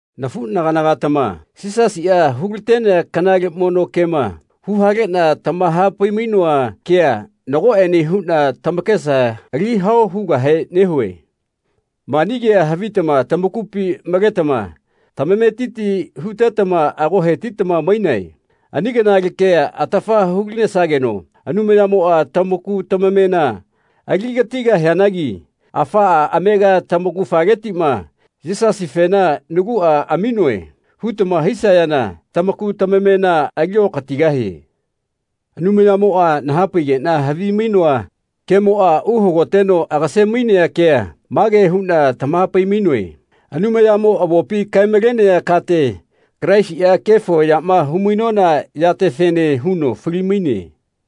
Nafuꞌnagana-gatama Yisasiꞌa hulatenea kanale mono kema huhaleꞌna tamahapai-mainoa kea nagoꞌene huꞌna tamakesa ali hao hugahe nehue. Mani kea havitama tamakupi maletama tamametiti hutetama ago hetitama mainae Ani kanale kea atafa hulinesageno Anumayamoꞌa tamaku tamamena aligatigahianagi afaꞌa amega tamaugafaletiꞌma “Yisasifena naguꞌa aminoe.” hutama hisayana tamaku tamamena aliokatigahie. Anumayamoꞌa nahapaigeꞌna havimainoa kemoꞌa uhagoteno agase-mainea kea mage huꞌna tamahapai-mainoe Anumayamo avopi kae-malenea kate Kalaisiꞌa kefo yama humainona yatefene huno fali-maine.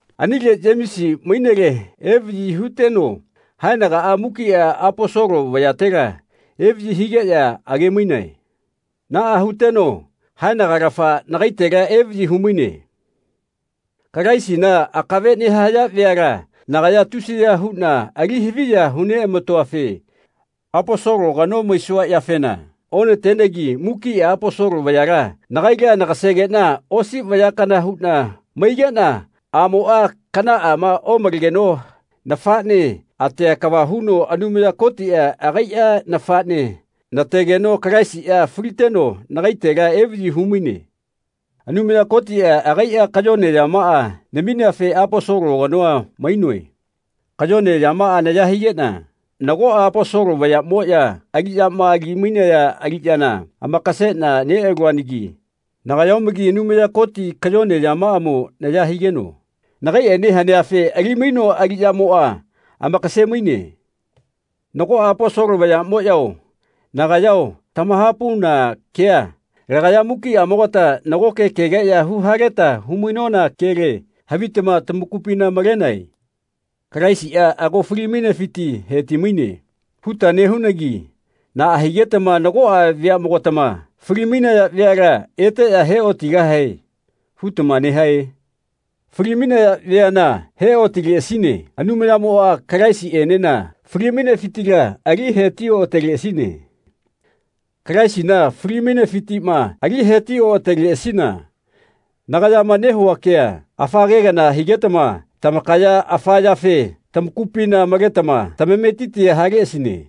Anile Yemesi mainele evaꞌyi huteno haenagaꞌa mukiꞌa Aposolo vayatela evaꞌyi higeꞌya age-mainae. Naꞌa huteno haenagalafa nagaitela evaꞌyi humaine. Kalaisina akave nehaya veala nagaya tusiya huꞌna ali haviya humatenoafe Aposolo kano maisua yafena onatenegi mukiꞌa Aposolo vayala nagaila nagasegeꞌna osi vaya kana huꞌna maigeꞌna aꞌmoꞌa kanaꞌa omalegeno nafaꞌne atea kava huno Anumaya Kotiꞌa agaiꞌa nafaꞌne nategeno Kalaisiꞌa faliteno nagaitela evaꞌyi humaine. Anumaya Kotiꞌa agaiꞌa kayone yamaꞌa namineafe Aposolo kanoa mainoe. Kayone yamaꞌa naya higeꞌna nagoꞌa Aposolo vayaꞌmoꞌya aliꞌyama ali-mainaya aliꞌyana amakaseꞌna neꞌaluanagi nagaya omagi Anumaya Koti kayone yamaꞌamo naya higeno nagaiꞌene haneafe ali-mainoa aliꞌyamoꞌa amakase-maine. Nagoꞌa Aposolo vayaꞌmoꞌyao nagayao tamahapauna kea lagaya mukiꞌamogata nagoke kegeꞌya huhaleta humainona kele havitama tamakupina malenae. “Kalaisiꞌa ago fali-mainefiti heti-maine.” huta nehunagi naꞌa higetama nagoꞌa veaꞌmogatama “Fali-mainaya veala eteꞌya heotigahae.” hutama nehae? Fali-mainaya veaꞌma he-otinaleꞌasine Anumayamoꞌa Kalaisiꞌenena fali-mainefitila ali heti-oꞌateleꞌasine. Kalaisina fali-mainefitiꞌma ali heti-oꞌateleꞌasina nagayama nehua kea afa ke kana higetama tamakaya afa yafe tamakupina maletama tamametitia haleꞌasine.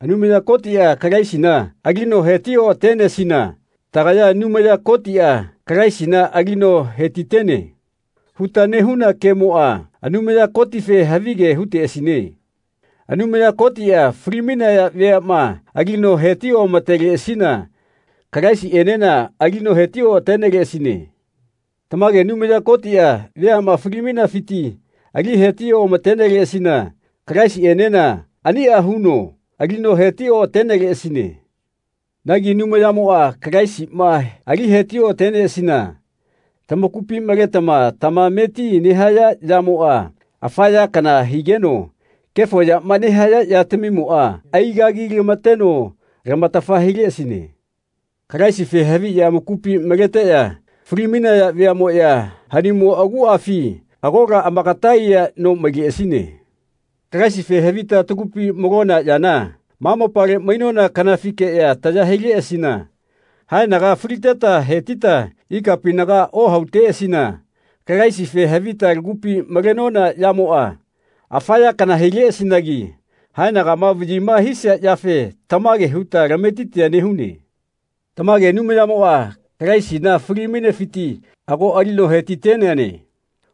Anumaya Kotiꞌa Kalaisina alino heti-oꞌatenesina tagaya “Anumaya Kotiꞌa Kalaisina alino hetitene.” huta nehuna kemoꞌa Anumaya Kotife havige huteꞌasine. Anumaya Kotiꞌa fali-mainaya veaꞌma alino heti-oꞌamateleꞌasina Kalaisiꞌenena alino heti-oꞌateneleꞌasine. Tamage Anumaya Kotiꞌa veaꞌma fali-mainafiti ali heti-omateneleꞌasina Kalaisiꞌenena aniꞌa huno alino heti-oꞌateneleꞌasine. Nagi Anumayamoꞌa Kalaisima ali heti-oꞌatenesina tamakupi maletama tamameti nehaya yamoꞌa afa ya kana higeno kefo yama nehaya yatamimoꞌa aigagilamateno lamatafa hileꞌasine. Kalaisife haviꞌya amakupi maleteꞌya fali-mainaya veaꞌmoꞌya haniꞌmo aguꞌafi agola amakata aiya no maileꞌasine. Kalaisife havita tagupi malona yana ma mopale mainona kanafikeꞌya taya hileꞌasina haenaga faliteta hetita ikapinaga ohauteꞌasina Kalaisife havita lakupi malenona yamoꞌa afa ya kana huleꞌasinagi haenagama vaꞌyima hisia yafe tamage huta lametitia nehune. Tamage Anumayamoꞌa Kalaisina fali-mainefiti ago alino hetiteneane.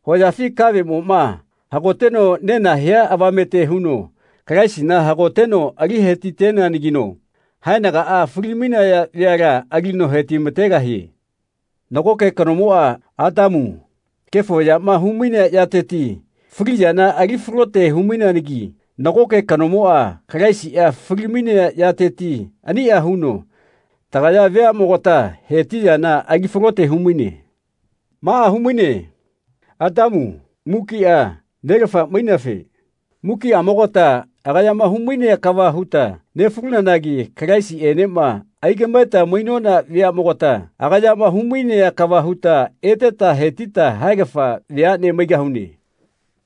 Hoyafi kaveꞌmoꞌma hagoteno nena hia avamete huno Kalaisina hagoteno ali hetiteneanagino haenagaꞌa fali-mainaya veala alino hetimategahie. Nagoke kanomoꞌa, Atamu, kefo yama humainea yateti fali yana ali falote humaineanagi nagoke kanomoꞌa, Kalaisiꞌa, fali-mainea yateti aniꞌa huno tagaya veaꞌmogata heti yana ali falote humaine. Maꞌa humaine Atamu mukiꞌa nelafa maineafe mukiꞌamogata agayama humainea kava huta nefalunanagi Kalaisiꞌenema aigaꞌmaeta mainona veaꞌmogata agayama humainea kava huta eteta hetita haegafa veaꞌne maigahune.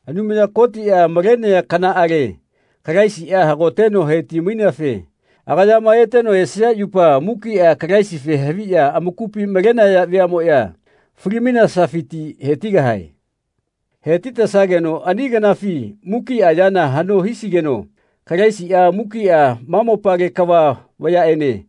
Anumaya Kotiꞌa malenea kanaꞌale Kalaisiꞌa hagoteno heti-maineafe agayama eteno esia yupa mukiꞌa Kalaisife haviꞌya amakupi malenaya veaꞌmoꞌya fali-mainesafiti hetigahae. Hetitesageno ani kanafi mukiꞌa yana haꞌno hisigeno Kalaisiꞌa mukiꞌa ma mopale kava vayaꞌene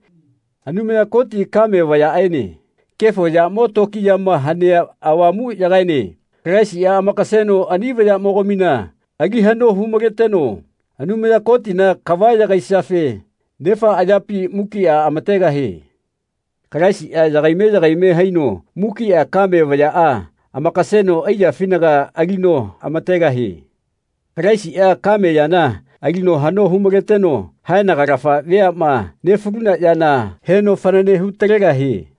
Anumaya Koti kame vayaꞌaene Kefo yamo tokiyama hanea Avamuꞌyagaene Kalaisiꞌa amakaseno ani vayaꞌmogamina ali haꞌno humaleteno Anumaya Kotina kava yagaisiafe Nefa ayapi mukiꞌa amategahie. Kalaisiꞌa yagaime yagaime haino mukiꞌa kame vayaꞌa amakaseno aiyafinaga alino amategahie. Kalaisiꞌa kame yana ali haꞌno humaleteno haenagalafa veaꞌma nefaluna yana heno fanane hutalegahie.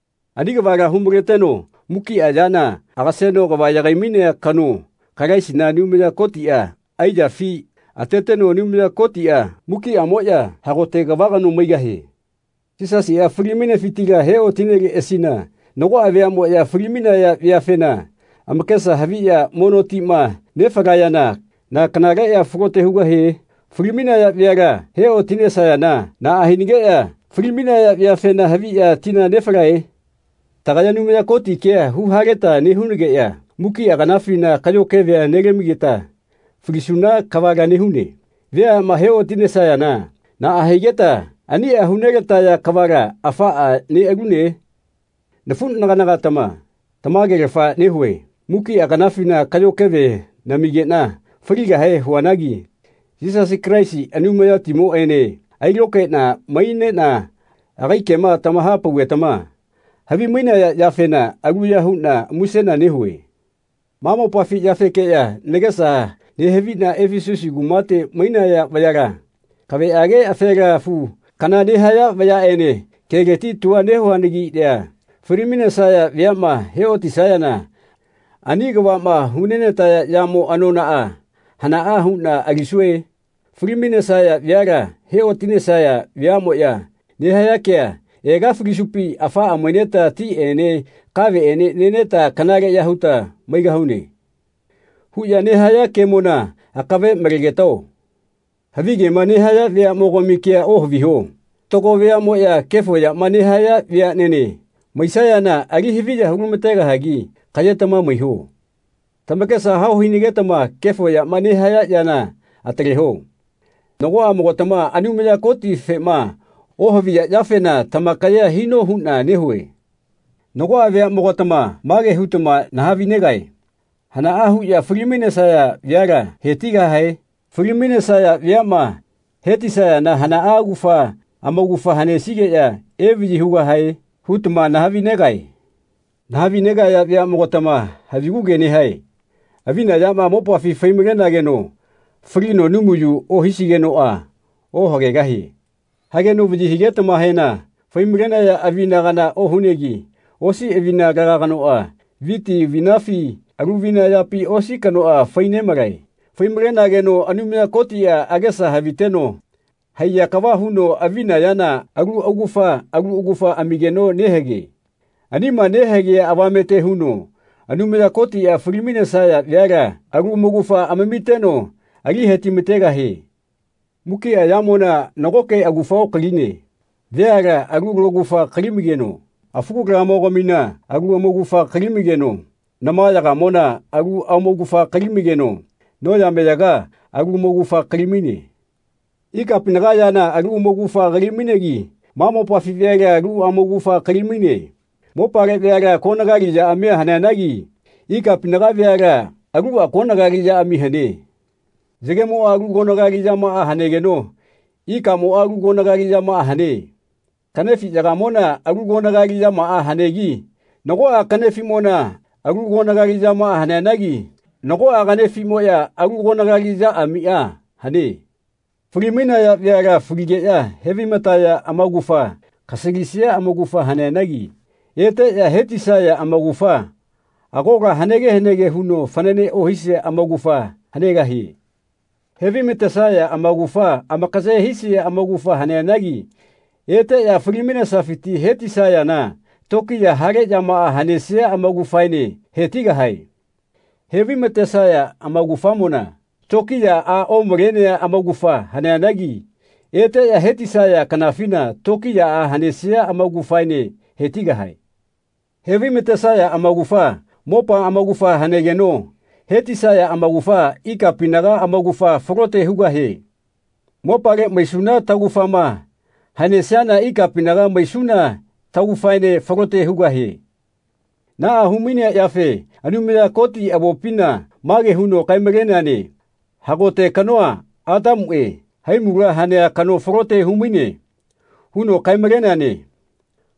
Ani kavala humaleteno mukiꞌa yana agaseno kava yagai-mainea kano Kalaisina, Anumaya Kotiꞌa aiyaꞌafi ateteno Anumaya Kotiꞌa mukiꞌamoꞌya hagote kava kano maigahie. Yisasiꞌa fali-mainefitila heotineleꞌasina nagoꞌa veaꞌmoꞌya fali-mainaya veafena amakesa haviꞌya mono tima nefalayana na kanale ya falote hugahie? Fali-mainaya veala heotisayana naꞌa hinageꞌya fali-mainaya veafena haviꞌya tina nefalae? Tagaya Anumaya Koti kea huhaleta nehunageꞌya mukiꞌa kanafina kaꞌyo kevea lamigeta falisuna kavala nehune. Veaꞌma heotisayana naꞌa higeta ani hu nelataya kavala afaꞌa neꞌalune? Nafuꞌnagana-gatama tamagelafa nehue mukiꞌa kanafina kaꞌyo keve namigeꞌna faligahe huanagi Yisasi Kalaisi Anumayatimoꞌene ailokaeꞌna maineꞌna agai kema tamahapaugetama havimainaya yafena aluya huꞌna musena nehue. Ma mopafi yafekeꞌya nagesa nehaviꞌna Efesusi kumate mainaya vayala, kaveꞌage afela afu kana nehaya vayaꞌene keleti tua nehuanagiꞌya fali-mainesaya veaꞌma heotisayana ani kavaꞌma hunenataya yamo anonaꞌa hanaꞌa huꞌna alisue? Falimainesaya veala heotisayana veaꞌmoꞌya nehaya kea “Ega falisupi afaꞌa maineta tiꞌene kaveꞌene neta kanaleꞌya huta maigahune.” huꞌya nehaya kemona akave malegetao. Havigema nehaya veaꞌmogami kea ohaviho. Fatago veaꞌmoꞌya kefo yama nehaya veaꞌnene maisayana ali haviya hulamategahagi kaꞌyetama maiho. Tamakesa hao hinagetama kefo yama nehaya yana ataleho. Nagoꞌamogatama Anumaya Kotifema ohaviya yafena tamakaye hino huꞌna nehue. Nagoꞌa veaꞌmogatama mage hutama nahavi-negae “Hanaꞌa huꞌya fali-mainesaya veala hetigahae? Fali-mainesaya veaꞌma hetisayana hana augafa amaugafa hanesigeꞌya evaꞌyi hugahae?” hutama nahavi-negae. Nahavi-negaya veaꞌmogatama havigu ke nehae. Avina yama mopafi fai-malenageno falino numayu ohisigenoꞌa ohagegahie. Hageno vaꞌyi higetamahena fai-malenaya avina kana ohunegi osi avina alaga kanoꞌa viti avinafi alu avina yapi osi kanoꞌa fai-nemalae Fai-malenageno Anumaya Kotiꞌa agesa haviteno haiya kava huno avina yana alu augafa alu augafa amigeno nehage. Anima nehagea avamete huno Anumaya Kotiꞌa fali-mainesaya veala alu amaugafa amamiteno ali hetimategahie. Mukiꞌa yamona nagoke augafa okaline. Veala alu laugafa kali-maigeno afu kalamogamina alu amaugafa kali-maigeno namayaga-mona alu amaugafa kali-maigeno noyameyaga alu amaugafa kali-maine. Ikapinaga yana alu amaugafa kali-mainegi ma mopafi veala alu amaugafa kali-maine. Mopale veala konagali yaꞌamia haneanagi ikapinaga veala aluꞌa konagali yaꞌami hane. Yagemoꞌa alu konagali yamaꞌa hanegeno ikamoꞌa alu konagali yamaꞌa hane. Kaꞌnefiꞌyagamona alu konagali yamaꞌa haneanagi nagoꞌa kaꞌnefiꞌmona alu konagali yamaꞌa haneanagi nagoꞌa kaꞌnefiꞌmoꞌya alu konagali yaꞌamiꞌa hane. Fali-mainaya veala faligeꞌya hevaimataya amaugafa kasalisia amaugafa haneanagi eteꞌya hetisaya amaugafa agola hanege hanege huno fanane ohisia amaugafa hanegahie. Hevaimatesaya amaugafa amakaye hisia amaugafa haneanagi eteꞌya fali-mainesafiti hetisayana tokiya hale yamaꞌa hanesia amaugafaene hetigahae. Hevaimatesaya amaugafamona tokiyaꞌa omalenea amaugafa haneanagi eteꞌya hetisaya kanafina tokiyaꞌa hanesia amaugafaene hetigahae. Hevaimatesaya amaugafa mopa amaugafa hanegeno hetisaya amaugafa ikapinaga amaugafa falote hugahie. Mopale maisuna taugafama hanesiana ikapinaga maisuna taugafaene falote hugahie. Naꞌa humainea yafe Anumaya Koti avopina mage huno kae-maleneane “Hagote kanoa, Atamuꞌe, haimula hanea kano falote humaine.” huno kae-maleneane.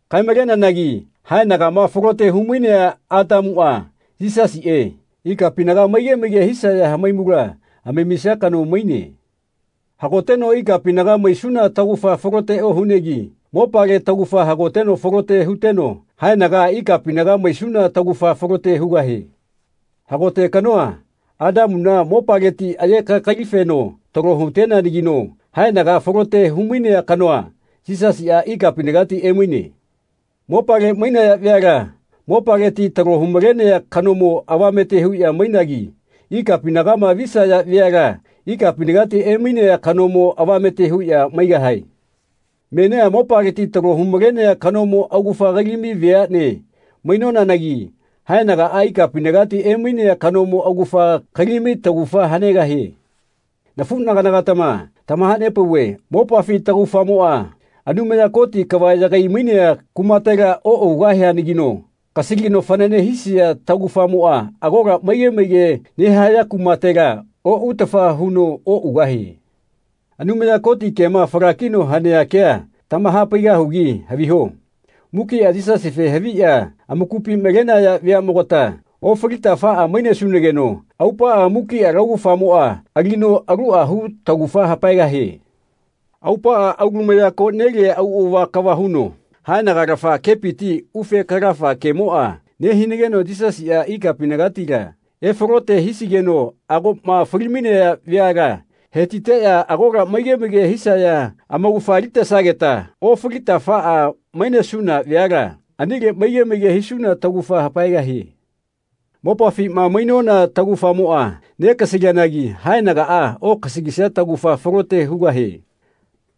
Kae-maleneanagi haenagama falote humainea Atamuꞌa, Yisasiꞌe, ikapinaga maige maige hisaya hamaimula amamisia kano maine. Hagoteno ikapinaga maisuna taugafa falote ohunegi mopale taugafa hagoteno falote huteno haenaga ikapinaga maisuna taugafa falote hugahie. Hagote kanoa, Atamuna, mopaleti aye kakali-feno talo huteneanagino haenaga falote humainea kanoa, Yisasiꞌa ikapinagati emaine. Mopale mainaya veala mopaleti talo humalenea kanomo avamete huꞌya mainagi ikapinagama visaya veala ikapinagati emainea kanomo avamete huꞌya maigahae. Menia mopaleti talo humalenea kanomo augafa kali-mai veaꞌne mainonanagi haenagaꞌa ikapinagati emainea kanomo augafa kali-mai taugafa hanegahie. Nafuꞌnagana-gatama tamahanepauve mopafi taugafamoꞌa Anumaya Koti kava yagai-mainea kumatela oꞌugahianagino kasalino fanane hisia taugafamoꞌa agola maige maige nehaya kumatela oꞌutafa huno oꞌugahie. Anumaya Koti kema falakino hanea kea tamahapaigahugi haviho. Mukiꞌa Yisasife haviꞌya amakupi malenaya veaꞌmogata ofalita afaꞌa mainesunageno aupaꞌa mukiꞌa laugafamoꞌa alino aluꞌa hu taugafa hapaegahie. Aupaꞌa aulumaya koꞌnelia auꞌava kava huno haenagalafa kepiti ufe kalafa kemoꞌa nehigeno Yisasiꞌa ikapinagatila efalote hisigeno agoꞌma fali-mainaya veala hetiteꞌya agola maige maige hisaya amaugafa alitesageta ofalita afaꞌa mainesuna veala anile maige maige hisuna taugafa hapaegahie. Mopafima mainona taugafamoꞌa negasalianagi haenagaꞌa okasalisia taugafa falote hugahie.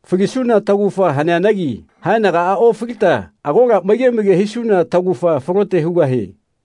Falisuna taugafa haneanagi haenagaꞌa ofalita agola maige maige hisuna taugafa falote hugahie.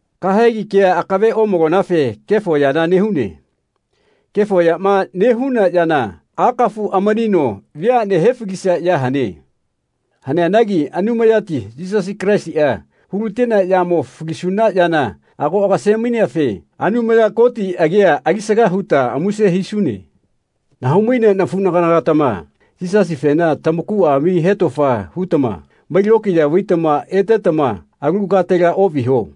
Kahegi kea akave omalonafe kefo yana nehune. Kefo yama nehuna yana akafu amanino veaꞌne hefalisia ya hane. Haneanagi Anumayati Yisasi Kalaisiꞌa hulatenea yamo falisuna yana ago agase-maineafe Anumaya Koti agia alisaga huta muse hisune. Nahau-mainea nafuꞌnagana-gatama Yisasifena tamakuꞌa ami hetofa hutama mai-lokiya vaitama etetama alu katela oꞌviho.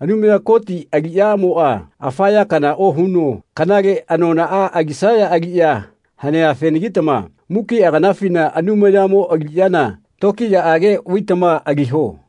Anumaya Koti aliꞌyamoꞌa afa ya kana ohuno kanale anonaꞌa alisaya aliꞌya haneafenagitama mukiꞌa kanafina Anumayamo aliꞌyana tokiyaꞌage vaitama aliho.